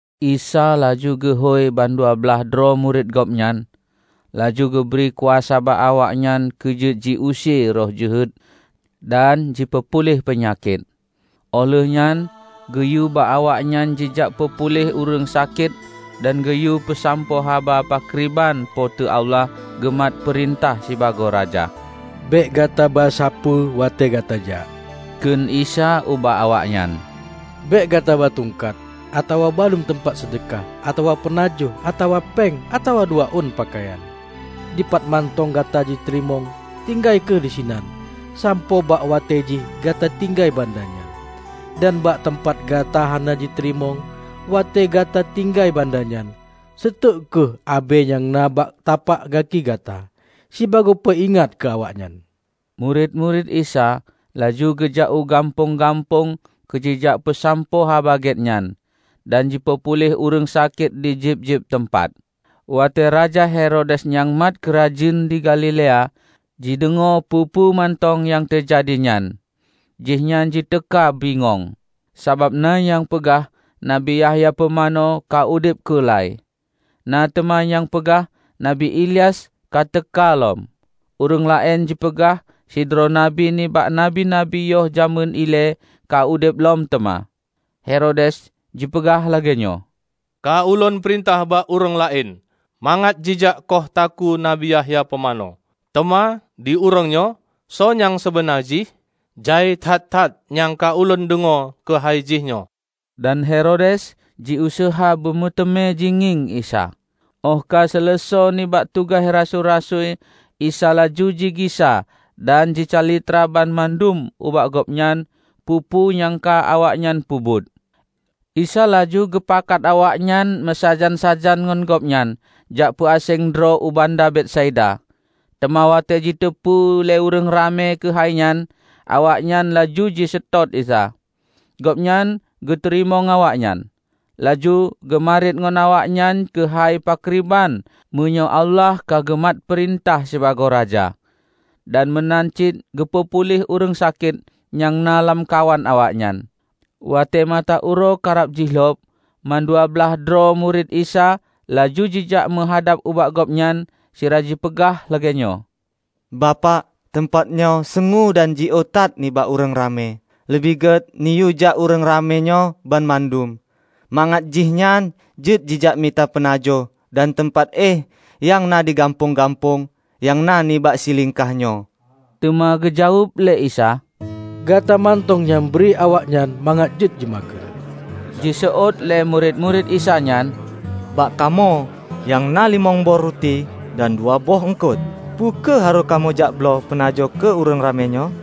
Isa laju geuhôi bandua blaih droe murit Gobnyan, laju geubri kuasa bak awaknyan keu jeuet jiuse roh jeuhet dan jipeupuléh peunyakét. Óh lheuehnyan geuyue bak awaknyan jijak peupuléh ureuëng sakét dan geuyue peusampoe haba pakriban Po teu Allah geumat peurintah sibagoe Raja. "Bék gataba sapeue watée gata jak," kheun Isa ubak awaknyan. "Bék gata ba tungkat, atawa baluem teumpat seudeukah, atawa peunajoh, atawa péng, atawa dua ôn peukayan. Dipat mantong gata jiteurimong, tinggai kheueh disinan sampoe bak watée jih gata tinggai banda nyan. Dan bak teumpat gata hana jiteurimong, watée gata tinggai banda nyan, seuteuk kheueh abée nyang na bak tapak gaki gata, sibagoe peuingat keu awaknyan." Murit-murit Isa laju geujak u gampông-gampông keu jijak peusampoe Haba Gét nyan dan jipeupuléh ureuëng sakét di jeueb-jeueb teumpat. Watée raja Herodes nyang mat keurajeuen di Galilea, jideungoe peue-peue mantong nyang teujadi nyan, jihnyan jiteuka bingong. Sabab na nyang peugah Nabi Yahya Pumanö ka udeb keula-i. Na teuma nyang peugah Nabi Ilyas ka teuka lom. Ureuëng laén jipeugah sidroe nabi nibak nabi-nabi yoh jamén ilée ka udeb lom teuma. Herodes jipeugah lagée nyoe, "Ka Ulôn peurintah bak ureuëng laén mangat jijak kôh takue Nabi Yahya Pumanö. Teuma di ureuëng nyoe, soe nyang seubeuna jih? Jai that-that nyang ka ulôn deungoe keuhai jihnyoe." Dan Herodes jiuseuha beu meuteumé jingieng Isa. Óh ka seuleusoe nibak tugaih rasui-rasui Isa laju jigisa dan jicalitra banmandum ubak gobnyan peue-peue nyang ka awaknyan peubuet. Isa laju geupakat awaknyan meusajan-sajan ngon gobnyan jak peuaséng droe u banda Betsaida. Teuma watée jiteupeu lé ureuëng ramé keuhai nyan, awaknyan laju jiseutôt Isa. Gobnyan geuteurimong awaknyan, laju geumariet ngon awaknyan keuhai pakriban meunyoe Allah ka geumat peurintah sibagoe Raja. Dan meunan cit geupeu puléh ureuëng sakét nyang na lamkawan awaknyan. Watée mata uroe karab jilhob, mandua blaih droe murit Isa laju jijak meuhadab ubak Gobnyan sira jipeugah lagée nyoe, "Bapak, teumpat nyoe seungue dan jiôh that nibak ureuëng ramé. Leubeh gét neuyue jak ureuëng ramé nyoe banmandum, mangat jihnyan jeuet jijak mita peunajoh dan teumpat éh nyang na di gampông-gampông nyang na nibak silingka nyoe." Teuma geujaweueb lé Isa, "Gata mantong nyang bri bak awaknyan mangat jeuet jimakheun." Jiseuôt lé murit-murit Isa nyan, "Bak kamoe nyang na limong boh ruti dan dua boh eungkot. Peu kheueh harôh kamoe jakbloe peunajoh keu ureuëng ramé nyoe?"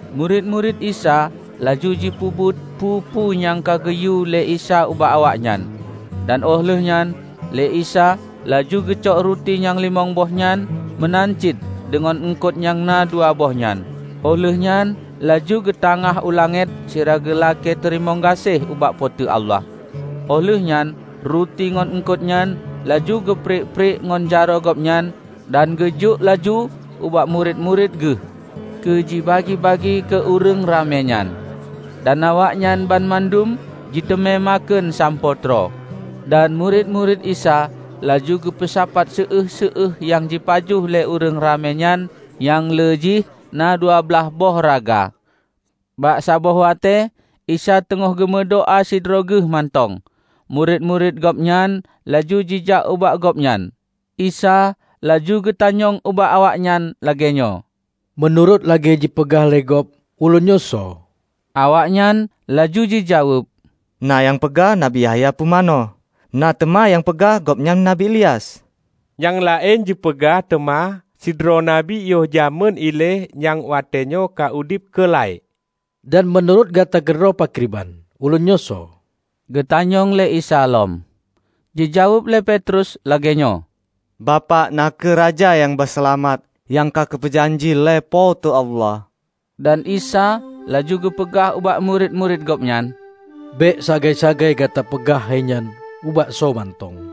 Murit-murit Isa laju jipeubuet peue-peue nyang ka geuyue lé Isa ubak awaknyan. Dan óh lheuehnyan lé Isa laju geucok ruti nyang limong boh nyan meunan cit deungon eungkot nyang na dua boh nyan, óh lheuehnyan laju geutangáh u langét sira geulakée teurimong gaséh ubak Po teu Allah. Óh lheueh nyan ruti ngon eungkot nyan laju geupriek-priek ngon jaroe gobnyan dan geujok laju ubak murit-murit geuh keu jibagi-bagi keu ureuëng ramé nyan. Dan awaknyan banmandum jiteumé makheun sampoe troe. Dan murit-murit Isa laju geupeusapat séueh-séueh nyang jipajoh lé ureuëng ramé nyan nyang le jih na dua blaih boh raga. Bak saboh watée, Isa teungoh geumeudoá sidroe geuh mantong, murit-murit Gobnyan laju jijak ubak Gobnyan. Isa laju geutanyong ubak awaknyan lagée nyoe, "Meunurot lagée jipeugah lé gob, Ulôn nyoe soe?" Awaknyan laju jijaweueb, "Na nyang peugah Nabi Yahya Pumanö. Na teuma nyang peugah gobnyan Nabi Ilyas, nyang laén jipeugah teuma sidroe nabi yoh jamén ilée nyang watéenyoe ka udeb keula-i." "Dan meunurot gata keudroe pakriban, Ulôn nyoe soe?" geutanyong lé Isa lom. Jijaweueb lé Petrus lagée nyoe, "Bapak na kheueh Raja Nyang ba Seulamat nyang ka geupeu janji lé Po teu Allah." Dan Isa laju geupeugah ubak murit-murit Gobnyan, "Bék sagai-sagai gata peugah hainyan ubak soe mantong."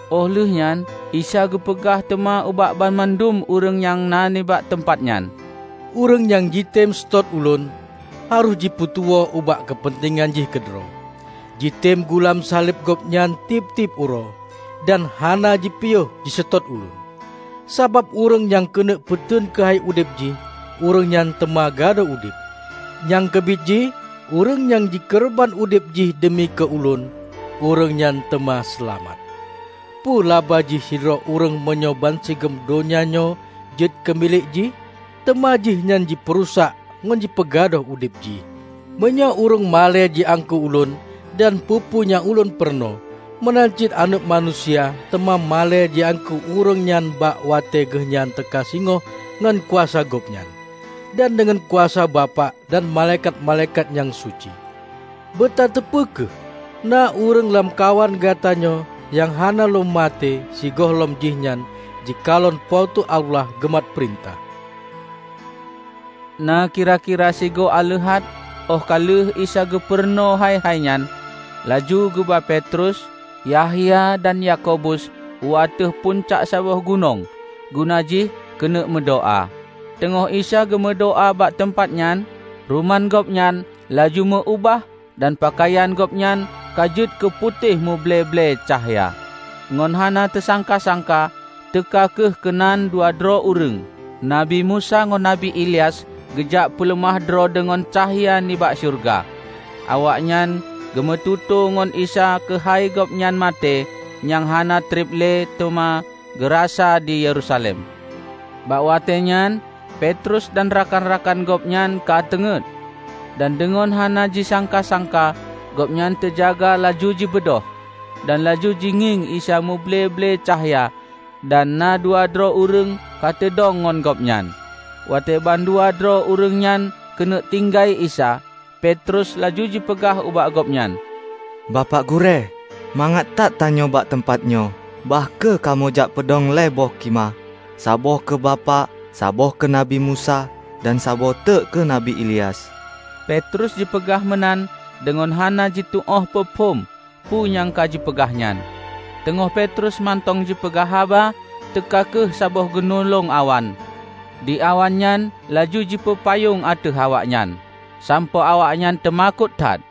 Óh lheuehnyan Isa geupeugah teuma ubak bandum ureuëng nyang na nibak teumpat nyan, "Ureuëng nyang jitem seutôt Ulôn, harôh jipeutuwoe ubak keupeuntengan jih keudroe, jitem gulam saleb gobnyan tieb-tieb uroe, dan hana jipiôh jiseutôt Ulôn. Sabab ureuëng nyang keuneuk peuteun keuhai udeb jih, ureuëng nyan teuma gadôh udeb. Nyang keubiet jih, ureuëng nyang jikeureubeuen udeb jih deumi keu Ulôn, ureuëng nyan teuma seulamat. Peue laba jih sidroe ureuëng meunyoe bansigom donya nyoe jeuet keu milék jih, teuma jihnyan jipeurusak ngon jipeugadôh udeb jih? Meunyoe ureuëng malée jiangkée Ulôn dan peue-peue nyang Ulôn peurunoe, meunan cit Aneuëk Manusia teuma malée jiangkée ureuëng nyan bak watée geuhnyan teuka singoh ngon kuasa Gobnyan, dan deungon kuasa Bapak dan malaikat-malaikat nyang suci! Beutateupeue kheueh: na ureuëng lamkawan gata nyoe nyang hana lom maté sigohlom jihnyan jikalon Po teu Allah geumat peurintah." Na kira-kira sigoe aleuhat óh ka lheueh Isa geupurunoe hai-hai nyan, laju geuba Petrus, Yahya dan Yakobus u ateueh puncak saboh gunong guna jih keuneuk meudoá. Teungoh Isa geumeudoá bak teumpat nyan, ruman Gobnyan laju meu-ubah dan peukayan Gobnyan ka jeuet keuputéh meuble-ble cahya. Ngon hana teusangka-sangka, teuka kheueh keunan dua droe ureuëng, Nabi Musa ngon Nabi Ilyas geujak peuleumah droe deungon cahya nibak syeuruga. Awaknyan geumeututoe ngon Isa keuhai Gobnyan maté nyang hana treb le teuma geurasa di Yerusalem. Bak watée nyan Petrus dan rakan-rakan Gobnyan ka teungét, dan deungon hana jisangka-sangka Gobnyan teujaga laju jibeudôh, dan laju jigieng Isa muble-ble cahya dan na dua droe ureuëng ka teudong ngon Gobnyan. Watée bandua droe ureuëng nyan keuneuk tinggai Isa, Petrus laju jipeugah ubak Gobnyan, "Bapak Gurée, mangat that tanyoe bak teumpat nyoe. Bah kheueh kamoe jak peudong lhée boh khimah: saboh keu Bapak, saboh keu Nabi Musa, dan saboh teuk keu Nabi Ilyas." (Petrus jipeugah meunan deungon hana jituôh peuphom peu nyang ka jipeugah nyan.) Teungoh Petrus mantong jipeugah haba, teuka kheueh saboh gunulong awan, di awan nyan laju jipeupayong ateueh awaknyan, sampoe awaknyan teumakot that.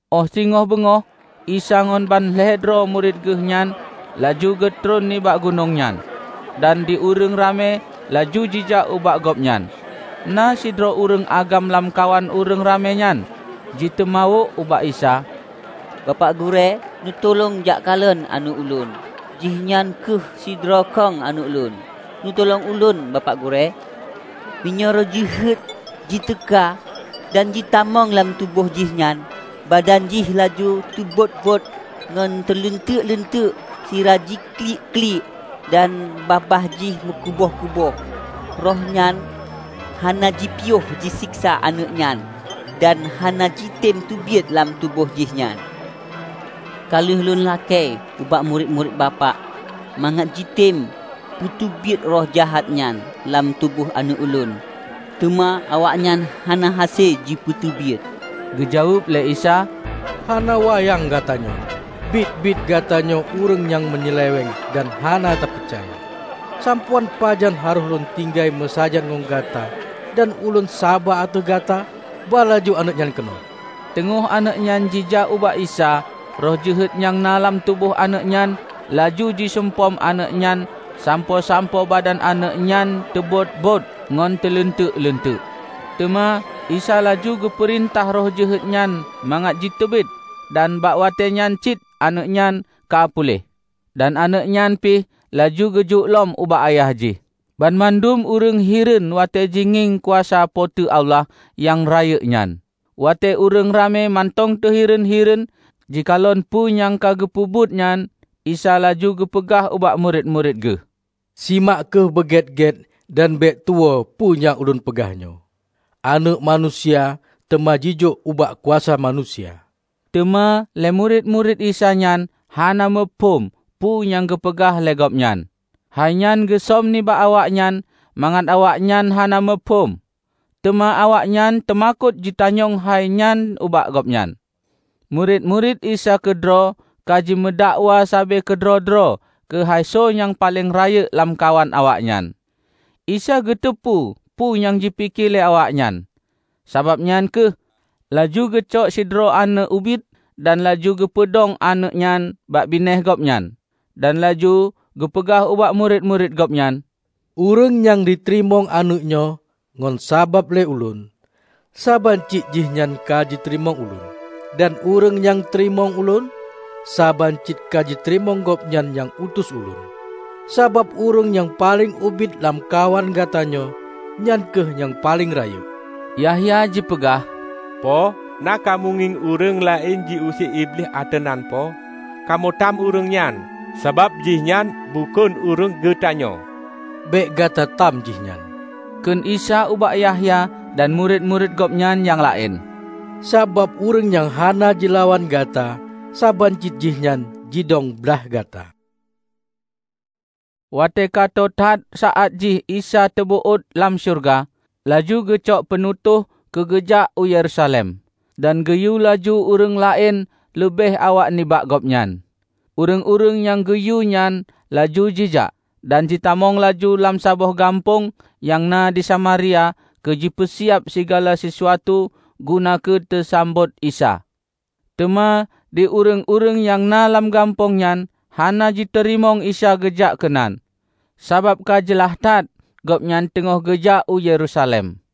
Óh singoh beungoh Isa ngon ban lhée droe murit geuh nyan laju geutron nibak gunong nyan, dan di ureuëng ramé laju jijak ubak Gobnyan. Na sidroe ureuëng agam lamkawan ureuëng ramé nyan jiteumawök ubak Isa, "Bapak Gurée, neutulông jak kalon aneuëk ulôn -- jih nyan kheueh sidroe kong aneuëk ulôn, neutulông ulôn Bapak Gurée! Meunyoe roh jeuhet jiteuka dan jitamong lam tuboh jihnyan, badan jih laju teubot-bot ngon teuleunteuk-leunteuk sira jiklik-klik dan babah jih mukuboh-kuboh. Roh nyan hana jipiôh jiseksa aneuëk nyan dan hana jitem teubiet lam tuboh jihnyan! Ka lheueh ulôn lakée ubak murit-murit Bapak mangat jitem peuteubiet roh jeuhet nyan lam tuboh aneuëk ulôn, teuma awaknyan hana hase jipeuteubiet." Geujaweueb lé Isa, "Hana wayang gata nyoe! Biet-biet gata nyoe ureuëng nyang meunyeuleweng dan hana tapeucaya! Sampoe án pajan harôh lôn tinggai meusajan ngon gata dan ulôn saba ateueh gata? Ba laju aneuëk nyan keunoe!" Teungoh aneuëk nyan jijak ubak Isa, roh jeuhet nyang na lam tuboh aneuëk nyan laju jiseumpom aneuëk nyan sampoe-sampoe badan aneuëk nyan teubot-bot ngon teuleunteuk-leunteuk. Teuma Isa laju geupeurintah roh jeuhet nyan mangat jiteubiet dan bak watée nyan cit aneuëk nyan ka puléh. Dan aneuëk nyan pih laju geujok lom ubak ayah jih. Banmandum ureuëng hireuen watée jingieng kuasa Po teu Allah nyang rayeuk nyan. Watée ureuëng ramé mantong teuhireuen-hireuen jikalon peu nyang ka geupeubuet nyan, Isa laju geupeugah ubak murit-murit geuh, "Simak kheueh beugét-gét dan bék tuwoe peue nyang Ulôn peugah nyoe: Aneuëk Manusia teuma jijok ubak kuasa manusia." Teuma lé murit-murit Isa nyan hana muphom peue nyang geupeugah lé Gobnyan. Hainyan geusöm nibak awaknyan mangat awaknyan hana muphom. Teuma awaknyan teumakot jitanyong hai nyan ubak Gobnyan. Murit-murit Isa keudroe ka jimeudakwa sabe keudroe-droe keuhai soe nyang paleng rayeuk lamkawan awaknyan. Isa geuteupeue peue nyang jipike lé awaknyan, sabab nyan kheueh laju geucok sidroe aneuëk ubit dan laju geupeudong aneuëk nyan bak binéh Gobnyan. Dan laju geupeugah ubak murit-murit Gobnyan, "Ureuëng nyang jiteurimong aneuëk nyoe ngon sabab lé Ulôn, saban cit jihnyan ka jiteurimong ulôn. Dan ureuëng nyang teurimong ulôn, saban cit ka jiteurimong Gobnyan nyang utus Ulôn. Sabab ureuëng nyang paleng ubit lamkawan gata nyoe, nyan kheueh nyang paleng rayeuk!" Yahya jipeugah, "Po, na kamoe ngieng ureuëng laén ji use iblih ateueh nan Po, kamoe tam ureuëng nyan, sabab jihnyan bukon ureuëng geutanyoe." "Bék gata tam jihnyan," kheun Isa ubak Yahya dan murit-murit Gobnyan nyang laén, "sabab ureuëng nyang hana jilawan gata, saban cit jihnyan jidong blaih gata." Watée ka tô that saát jih Isa teubeuôt lam syeuruga, laju geucok peunutôh keu geujak u Yerusalem. Dan geuyue laju ureuëng laén leubeh awak nibak Gobnyan. Ureuëng-ureuëng nyang geuyue nyan laju jijak, dan jitamong laju lam saboh gampông nyang na di Samaria keu jipeusiab sigala sisuatu guna keu teusambot Isa. Teuma di ureuëng-ureuëng nyang na lam gampông nyan hana jiteurimong Isa geujak keunan, sabab ka jeulaih that gobnyan teungoh geujak u Yerusalem.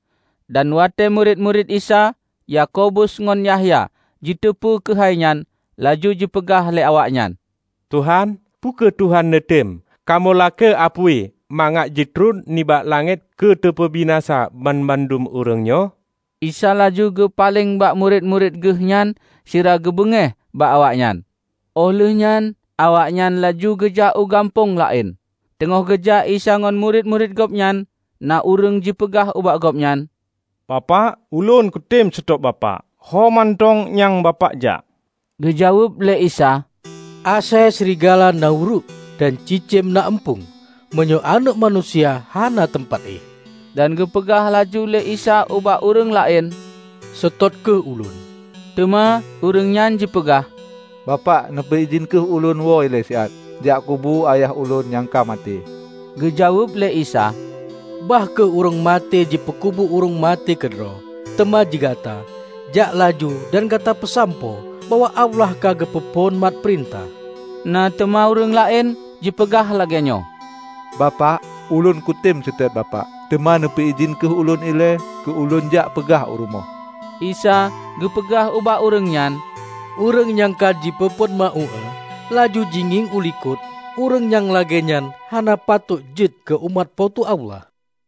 Dan watée murit-murit Isa, Yakobus ngon Yahya jiteupeu keuhai nyan, laju jipeugah lé awaknyan, "Tuhan, peu kheueh Tuhan neutem, kamoe lakée apui mangat jitron nibak langét keu teupeubinasa banmandum ureuëng nyoe?" Isa laju geupaleng bak murit-murit Geuh nyan sira geubeungéh bak awaknyan. Óh lheuehnyan awaknyan laju geujak u gampông laén. Teungoh geujak Isa ngon murit-murit Gobnyan, na ureuëng jipeugah ubak Gobnyan, "Bapak, ulôn kutem seutôt Bapak ho mantong nyang Bapak jak!" Geujaweueb lé Isa, "Asée srigala na uruek, dan cicém na eumpung, meunyoe Aneuëk Manusia hana teumpat éh." Dan geupeugah laju lé Isa ubak ureuëng laén, "Seutôt kheueh Ulôn." Teuma ureuëng nyan jipeugah, "Bapak, neupeu idhin kheueh Ulôn woe leubeh ilée Lôn jak kubu ayah Ulôn nyang ka maté." Geujaweueb lé Isa, "Bah kheueh ureuëng maté jipeukubu ureuëng maté keudroe. Teuma digata, jak laju dan gata peusampoe bahwa Allah ka geupeu phon mat peurintah." Na teuma ureuëng laén jipeugah lagée nyoe, "Bapak, ulôn kutem seutôt Bapak, teuma neupeu idhin kheueh ulôn ilée keu lôn jak peugah u rumoh." Isa geupeugah ubak ureuëng nyan, "Ureuëng nyang ka jipeuphon meu-uéue, laju jingieng u likot, ureuëng nyang lagée nyan hana patot jeuet keu umat Po teu Allah."